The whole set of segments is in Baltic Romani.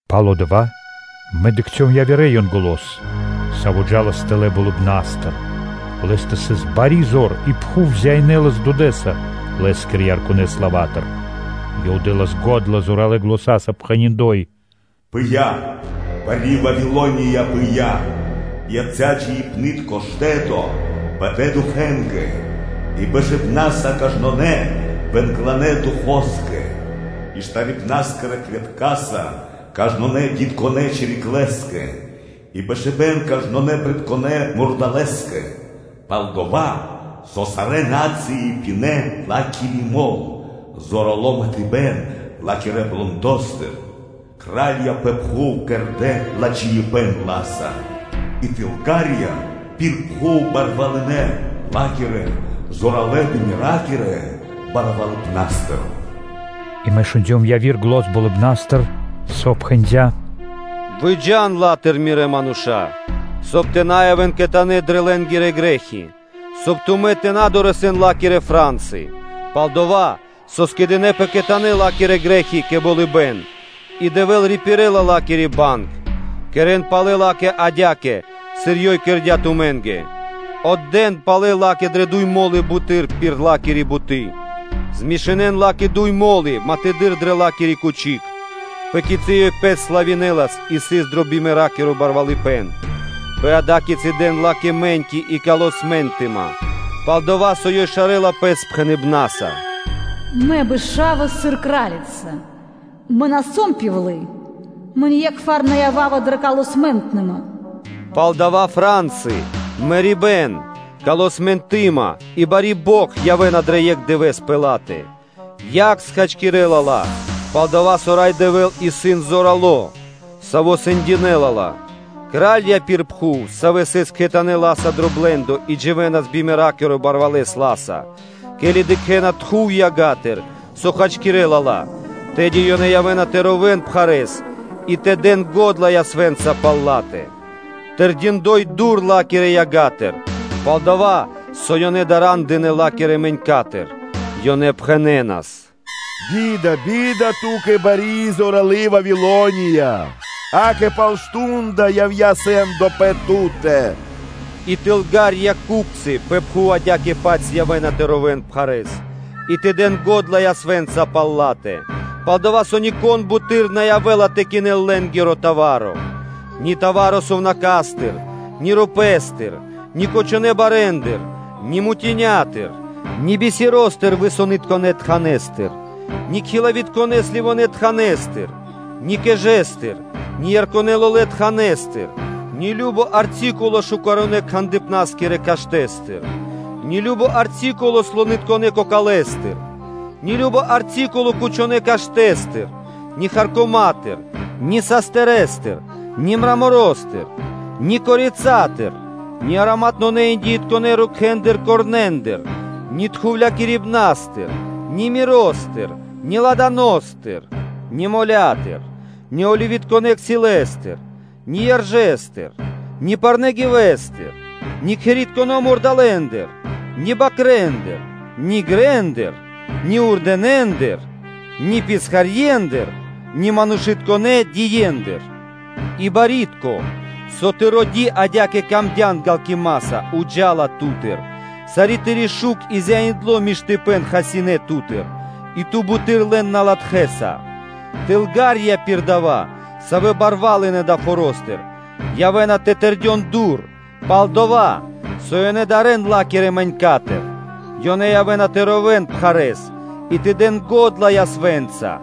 Пало́ (после) дава́ мэ дыкхцём явирэ Янголо́с, саво́ джа́лас тэлэ́ болыбна́стыр. Лэ́стэ сыс бари зор и пхув зяинэлас сыр дуд (свэ́то) лэ́скирэ ярконэ славатыр. Ёв дэ́лас го́дла зоралэ́ заня́са, пхэни́: “Пыя́, бари Вавилония, пыя́ бари биладжакуны, и яця́ джиибнытконэ штэтоса бэдэ духэнгэ и бэшыбнаса кажнонэ́ бэнгланэ духоскэ, и штарибнаскирэ клеткаса кажнонэ́ джунгалэ́ (гидконэ́) чириклэ́скэ; долэ́скэ со сарэ́ на́цыи пинэ́ ла́кири мол, зорало́ матыбэн ла́кирэ блэндостыр. Кра́лья пэ пхув кэрдэ́ ладжаипэ́н ла́са и ку́пцы (тылга́рья) пир пхув барвалынэ ла́кирэ зоралэ́-бимеракирэ барвалыпнастыр.” И мэ шундём яви́р зан болыбна́стыр, сави́ пхэндя́: “Выджа́н ла́тыр мирэ́ мануша́лэ; соб (кай) тэ на явэ́н кхэтанэ́ дрэ лэ́нгирэ грэ́хи, соб (кай) тумэ́ тэ на дорэсэн ла́кирэ фра́нсы: пал-дова́ со скэдынэ́пэ кхэтанэ́ ла́кирэ грэ́хи кэ болыбэ́н и Дэвэ́л рипирэла ла́кири банг. Кэрэ́н палэ ла́кэ адя́кэ, сыр ёй создыя́ тумэ́нгэ. Отдэ́н палэ ла́кэ дрэ дуй мо́лы буты́р пир ла́кири буты́. Змешынэн ла́кэ дуй мо́лы матэдыр мол дрэ ла́киро тахта́й; пэ кицы́ ёй пэс славинэлас и сыс дро бимеракиро барвалыпэ́н, пэ ада́кицы дэн ла́кэ мэ́ньки и калы смэнтныма. Пал-дова́ со ёй шарэла пэс пхэныбнаса: “Мэ бэшава сыр кра́лица. Мэ на сом пивлы (удова). Мэ ние́кхвар на ява́ва дрэ калы смэнтныма”: палдава́ фра́нсы, мэрибэ́н, смэнтныма роибнаса и бари бокх явэ́на дро екх дывэ́с пэ ла́тэ. Яг хачкирэ́ла сарэ́са ла, пал-дова́ со Рай Дэвэ́л исын зорало́, Саво́ сэндякирэ́ла ла. Кра́лья пир пхув, савэ́ сыс кхэтанэ́ ла́са дро блэ́ндо и дживэ́нас бимеракиро барвалэс ла́са, ке́ли дыкхэ́на тхув ягатыр, со хачкирэлас ла, тэды ёнэ явэ́на тэ ровэ́н пхарэ́с и тэ дэн го́дла ясвэ́нца пал ла́тэ. Тэрдиндой дур ла́кирэ ягатыр, пал-дова́ со ёнэ дара́ндынэ ла́кирэ мэнькатыр, ёнэ пхэнэнас: “Бида, би́да ту́кэ, бари и зоралы́ Вавилония! Акэ, пал мардо́ (шту́нда) явдя́ сэ́ндо пэ ту́тэ.” И ку́пцы (тылга́рья) пэ пхув адя́кэ-паць явэ́на тэ ровэ́н пхарэ́с и тэ дэн го́дла ясвэ́нца пал ла́тэ, пал-дова́ со нико́н буты́р на явэ́ла тэ кинэл лэ́нгиро товаро (арцикуло), ни арцикуло сувнака́стыр, ни рупэ́стыр, ни кучонэ́ барэндыр, ни мутинятыр, ни бисеростыр висонытконэ тханэстыр, ни сливитконэ (кхилавитконэ) тханэстыр, ни кэжэстыр, ни ярконэ лолэ́ тханэстыр, ни кажно товаро (арцикуло) шукаронэ-кхандыпнаскирэ каштэ́стыр, ни кажно товаро (арцикуло) слонытконэ кокалэстыр, ни кажно товаро (арцикуло) кучонэ́ каштэ́стыр, ни харкома́тыр, ни састырэстыр, ни мраморостыр; ни бахэстыр (корицатыр), ни ароматнонэ индиитконэ рукхэндыр (корнендыр), ни фимиамостыр, ни миростыр, ни ладаностыр, ни моля́тыр, ни оливитконэ дзэтэстыр, ни яржэстыр, ни парнэ́ гивэстыр, ни кхэритконэ́ мурдалэ́ндыр (жывёла́тыр), ни бакрэ́ндыр, ни грэндыр, ни вурдэнэндыр, ни писхарьендыр, ни манушытконэ́ дие́ндыр. И барьякирдэ́ (пло́ды), кэ савэ́ тыро́ ди адя́кэ тырдыяпэ ґалкимаса, джа́ла криг ту́тыр, сари́ тыри́ шук и зяиндло миштыпэ́н хасинэ́ ту́тыр, и ту буты́р лэн на латхэса. Тылгарья (ку́пцы) пир дава́, савэ́ барвалынэ далэ́ форо́стыр, явэ́на тэ тэрдён дур, пал-дова́ со ёнэ дарэ́на ла́кирэ мэнькатыр. Ёнэ явэ́на тэ ровэ́н пхарэ́с и тэ дэн ґодла ясвэ́нца,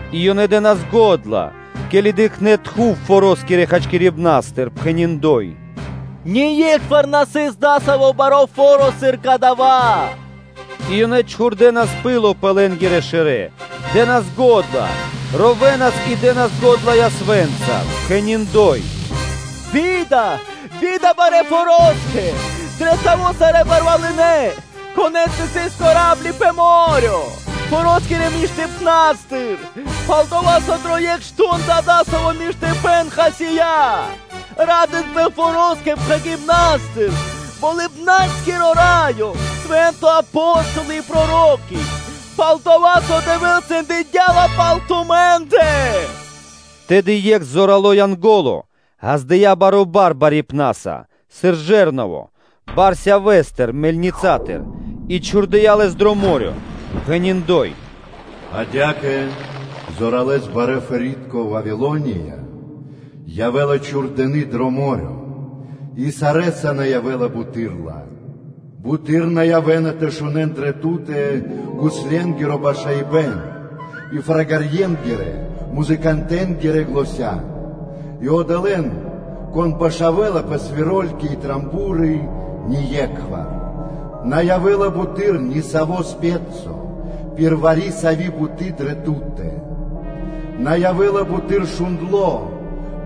и ёнэ дэ́нас го́дла, ке́ли дыкхнэ́ тхув форо́скирэ хачкирибнастыр, пхэни́: “Ние́кхвар на сыс дасаво баро́ фо́ро, сыр кадава́.” И ёнэ чхурдэнас пыло пэ лэнгрэ шэрэ́, дэ́нас го́дла, ровэнас и дэ́нас го́дла ясвэ́нца, пхэни́: “Бида, би́да, барэ́ фороскэ! Дро саво́ сарэ́ барвалынэ, конэ́стэ сыс па́рмы (корабли) пэ мо́рё (дэрья́в), форо́скирэ кучипнастыр! Пал-дова́ со дро екх мардо́ (шту́нда) дасаво миштыпэ́н хасия́.” Ра́дынпэ форо́скирэ пхагипнастыр, Болыбна́скиро Раё, свэ́нта, Апо́столы и проро́ки! Долэскэ, со Дэвэ́л сэндякирдя ла пал тумэ́ндэ. Тэды екх зорало́ Янго́ло ґаздыя́ баро́ бар барипнаса, сыр жэрново бар (бэлэди́н) сявэ́стыр/пхуртэ́стыр (мельницатыр) и чхурдыя́ лэс дро мо́рё (дэрья́в), пхэни́: “Адя́кэ зоралэ́с барэ́-форитко Вавилония явэ́ла чхурдыны дро мо́рё (дэрья́в), и сарэ́са на явэ́ла буты́р ла. Буты́р на явэ́на тэ шунэ́н дрэ ту́тэ гусленгиро башаибэн и багаибнаскирэ (музыкантэнгирэ) заня́, и одолэ́н, кон башавэла пэ свиро́льки и ро́ги (трубы) ние́кхвар. На явэ́ла буты́р ни саво́ спецо пир вари-сави́ буты́ (графа́ри/художнико) дрэ ту́тэ. На явэ́ла буты́р шундло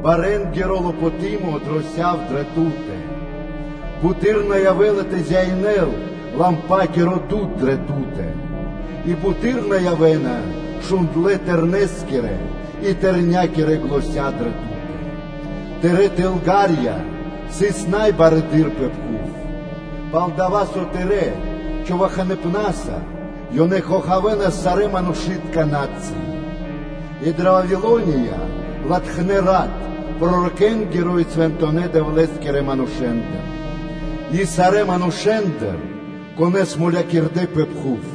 парма́киро лопоты́мо дро сяв/пхурт (мельница) дрэ ту́тэ. Буты́р на явэ́ла тэ зяинэл момолытконэскиро (лампакиро) дуд дрэ ту́тэ, и буты́р на явэ́на шундлэ́ тэрнэ́скирэ и тэрня́кирэ заня́ дрэ ту́тэ. Тырэ́ ку́пцы (тылга́рья) сыс най барэды́р пэ пхув, пал-дова́ со тырэ́ човаханыпнаса ёнэ хохавэнас сарэ́ манушы́тка на́цыи (народы).” И дрэ Вавилония латхнэ́ рат пророкэнгиро и свэнтонэ́-Дэвлэ́скирэ манушэ́ндыр и сарэ́ манушэ́ндыр, конэ́с мулякирдэ́ пэ пхув.